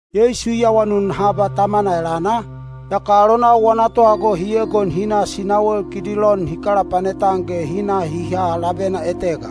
Yeisu i awanun haba Tamana elana, yaka alonau wana tohago hi egon hi na sinawel Kidilon hi kalapanet-an ge hi na hi ha labena etega.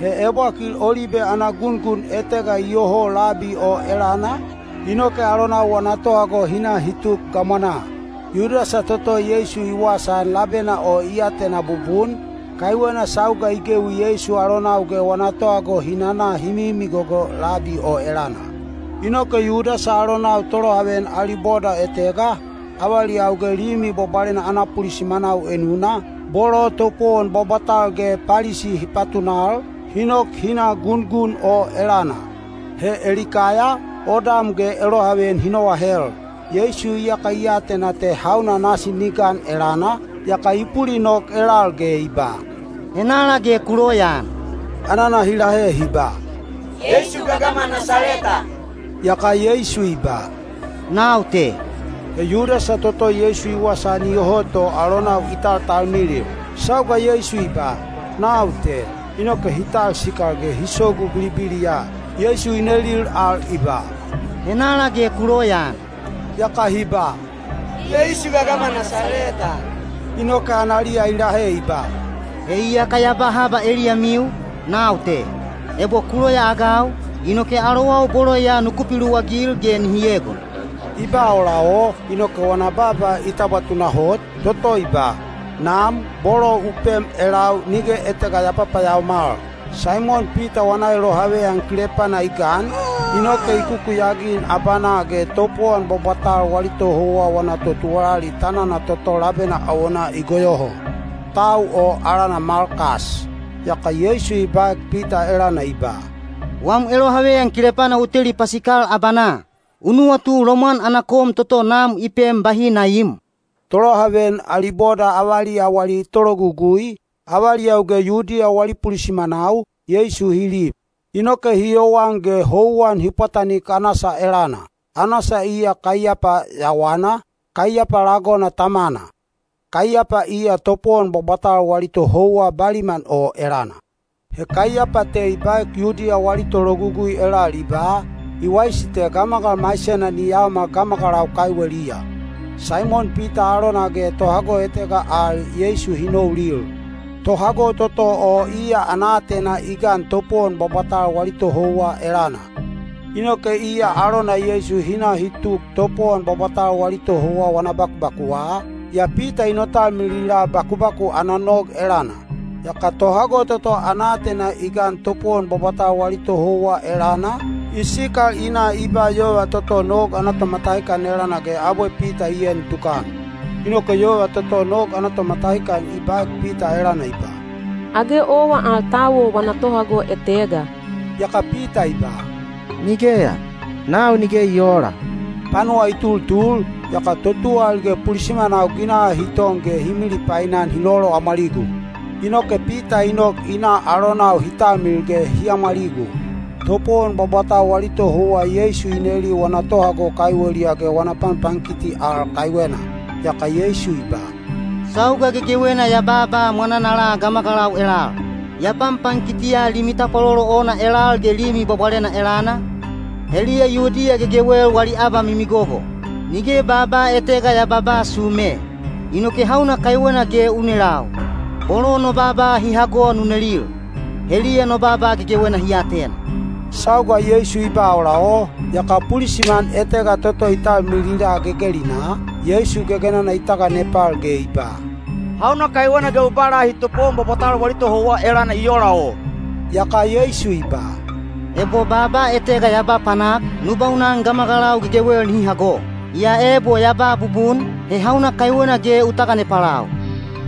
He ebwakil olibe ana gungun etega iyoho labi o elana, inoke alonau wana tohago hi na hi tuk gamwanaa. Yudasa toto Yeisu i wasaan labena o i atena bubun, kaiwena sauga i gewi Yeisu alonau ge wana tohago hi nana hi mimigogo labi o elana. Inoke Yudasa alonau tolohaveyan ali boda etega, avaliyau ge Limi Bwabwalena ana pulisimanau enuna, bolo topowon bwabwatal ge Palisi hi patunal, hi nok hi na gungun o elana. He elikaya, odam ge elohaveyan hi noahel. Yeisu iyaka i atena te hauna nasi ni gan elana, yaka i pulinok elal ge i ba, “Henala ge ku loyaan?” Anana hi lahe hi ba, “Yeisu gagama Nasaleta.” Yaka Yeisu i ba, “Nau te.” (He Yudasa toto Yeisu i wasaan iyoho to alonau i taltalmilil.) Sauga Yeisu i ba, “Nau te,” inoke hi talsikal ge hi sogu bilibiliya. Yeisu i nelil al i ba, “Henala ge ku loyaan?” Yaka hi ba, “Yeisu gagama Nasaleta.” Inoke analiya i lahe i ba, “He iyaka ya ba haba eliyamiu, nau te. Ebo ku loyaagau, inoke alowau bolo ya nuku piluwagil ge nihi egon.” I ba ola o, inoke wana baaba i tabwa tunahot, toto i ba, “Nam, bolo u pem elau nige etega ya papayaomal.” Saimon Pita wana elohaveyan kilepana i gan, inoke i kukuyagin abanaa ge topowon bwabwatal wali tohouwa wana totuwalali tanana toto labena awonaa i goyoho. Tau o alana Malkas. Yaka Yeisu i baek Pita elana i ba, “Wam elohaveyan kilepana u teli pasikal abanaa. U nuwatu lomwan ana kom toto Nam i pem bahi na iim?” Tolohaveyan ali boda avaliya wali tologugui, avaliyau ge Yudiya wali pulisimanau, Yeisu hi lib. Inoke hi yowan ge houwan hi pwatanik Anasa elana. Anasa iya Kaiyapa yawana, Kaiyapa lagona tamana. Kaiyapa iya topowon bwabwatal wali tohouwa baliman o elana. He Kaiyapa te i baek Yudiya wali tologugui elal i ba, “I waisi te gamagal maisena ni yaomal gamagalau kaiweliya.” Saimon Pita alona ge tohago etega al Yeisu hi noulil. Tohago toto o iya ana aatena i gan topowon bwabwatal wali tohouwa elana. Inoke iya alona Yeisu hi na hi tuk topowon bwabwatal wali tohouwa wana bakubakuwa, yaa Pita i notalmilila bakubaku ana nog elana. Yaka tohago toto ana aatena i gan topowon bwabwatal wali tohouwa elana, i sikal i na i ba yova toto nog ana tomatahikan elana ge abwe Pita i en tukan. Inoke yova toto nog ana tomatahikan i baek Pita elana i ba, “Age owa al tau o wana tohago etega?” Yaka Pita i ba, “Nigeya, nau nige i oola.” Panuwa i tultul, yaka totuwalali ge pulisimanau ginaha hi ton ge hi milipainan hi loloamwaligu. Inoke Pita i nok i na alonau hi talmilil ge hi amwaligu. Topowon bwabwatal wali tohouwa Yeisu i neli wana tohago kaiweliya ge wana panpankiti al kaiwena. Yaka Yeisu i ba, “Sauga gegewena ya baaba mwananala gamagalau elal. Ya panpankitiya limi tapwalolo ona elal ge Limi Bwabwalena elana, heliya Yudiya gegewel wali abamimigogo. Nige baaba etega ya babaa sume. Inoke hauna kaiwena ge u nelau? Bolo no baaba hi hago nu nelil. Heliya no baaba gegewena hi atena.” Sauga Yeisu i ba ola o, yaka pulisiman etega toto i talmilila gegelinaa, Yeisu gegenana i taganepal ge i ba, “Hauna kaiwena ge u ba lahi topowon bwabwatal wali tohouwa elana i ola o?” Yaka Yeisu i ba, “Ebo baaba etega ya ba panak, nu baunan gamagalau gegewel nihi hago. Yaa ebo ya ba bubun, he hauna kaiwena ge u taganepalau?”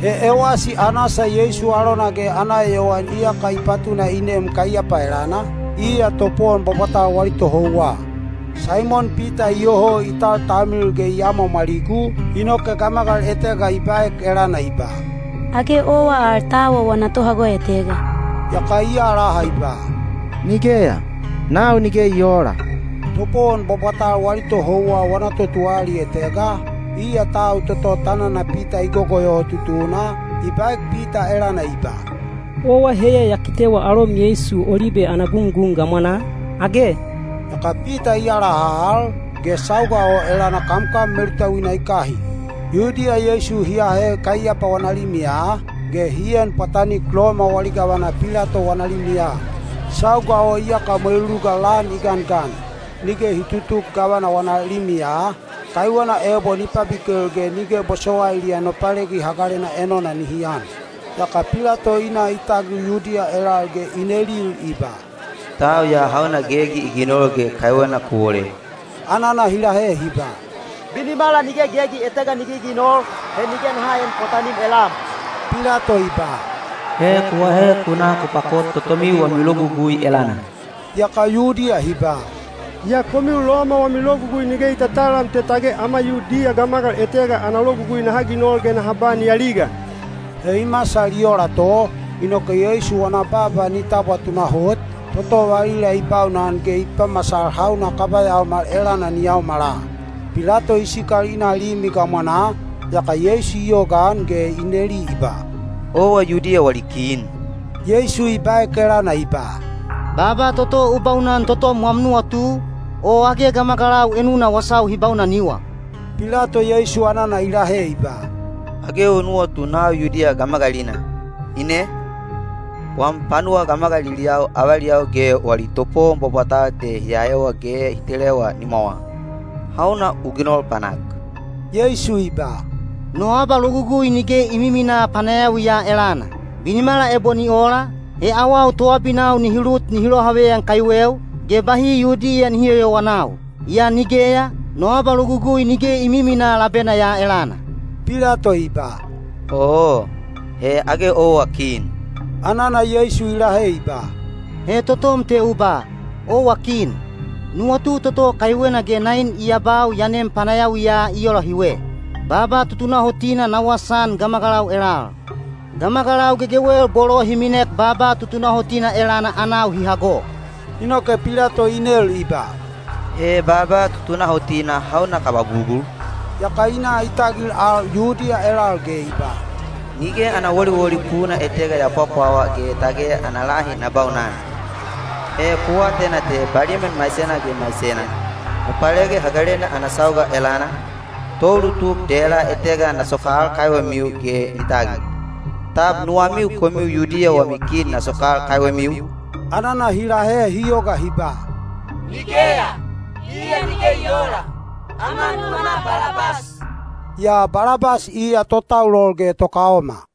(He ewasi Anasa Yeisu alona ge ana eyowan iyaka i patuna i nem Kaiyapa elana, iya topowon bwabwatal wali tohouwa.) Saimon Pita iyoho i taltalmilil ge i amwaamwaligu, inoke gamagal etega i baek elana i ba, “Age owa al tau o wana tohago etega?” Yaka i alaha i ba, “Nigeya, nau nige i oola.” Topowon bwabwatal wali tohouwa wana totuwalali etega, iya tau toto tanana Pita i gogoyoho tutuna, i baek Pita elana i ba, “Owa heiya ya kitewa alom Yeisu olibe ana gungun gamwanaa, age?” Yaka Pita i alaha al, ge sauga o elana kamkam melutauina i kahin. Yudiya Yeisu hi ahe Kaiyapa wana limiya, ge hi en pwatanik Loma wali gavana Pilato wana limiya. Sauga o iyaka mweluluga lan i gangan. Nige hi tutuk gavana wana limiya, kaiwena ebo ni pabikel ge nige bosowailiya Nopalegi Hagalena enona nihi an. Yaka Pilato i na i tagil Yudiya elal ge i nelil i ba, “Tau ya hauna gegi i ginol ge kaiwena ku wole?” Anana hi lahe hi ba, “Binimala nige gegi etega ni giginol, he nige naha een pwatanim elam.” Pilato i ba, “He ku ahe ku na ku pakot totomiu wami logugui elana.” Yaka Yudiya hi ba, “Yaa komiu Loma wami logugui nige i tatalam te tage ama Yudiya gamagal etega ana logugui naha ginol ge naha ba ni aliga.” He i masal i ola to, inoke Yeisu wana baaba ni tabwa tunahot, toto valila i baunan ge i pamasal hauna kaba yaomal elana ni yaomala. Pilato i sikal i na limi gamwanaa, yaka Yeisu i yogaan ge i neli i ba, “Owa Yudiya wali kin?” Yeisu i baek elana i ba, “Baaba toto u baunan totom wam nuwatu, o age gamagalau enuna wasau hi baunaniwa?” Pilato Yeisu anana i lahe i ba, “Age u nuwatu nau Yudiya gamagalina, ine? Wam panuwa gamagaliliyau avaliyau ge wali topowon bwabwatal te hi ahewa ge hi telewa nimwawa. Hauna u ginol panak?” Yeisu i ba, “No abalogugui nige i miminaa panayawi ya elana. Binimala ebo ni ola, he awau toabinau nihi lut nihi lohaveyan kaiweu, ge bahi Yudiya nihi yoyowanau. Yaa nigeya, no abalogugui nige i miminaa labena ya elana.” Pilato i ba, “Oo, he age owa kin!” Anana Yeisu i lahe i ba, “He totom te u ba, ‘Owa kin.’ Nuwatu toto kaiwena ge nain i abau ya nem panayawiya i ola hiwe: baaba tutunahotina na wasaan gamagalau elal. Gamagalau gegewel bolo hi minek baaba tutunahotina elana anau hi hago.” Inoke Pilato i nel i ba, “He baaba tutunahotina hauna kaba bugul?” Yaka i na i tagil al Yudiya elal ge i ba, “Nige ana woliwoli puna etega ya pwapwawa ge tage ana lahi na baunan. He ku atena te baliman maisena ge maisena, Nopalegi Hagalena ana sauga elana, toulutuk dela etega na sokal kaiwemiu ge ni tagil. Tab nuwamiu komiu Yudiya wami kin na sokal kaiwemiu?” Anana hi lahe hi yoga hi ba, “Nigeya, iya nige i oola! Ama nuwama Balabas!” Yaa Balabas iya totaulol ge tokaoma.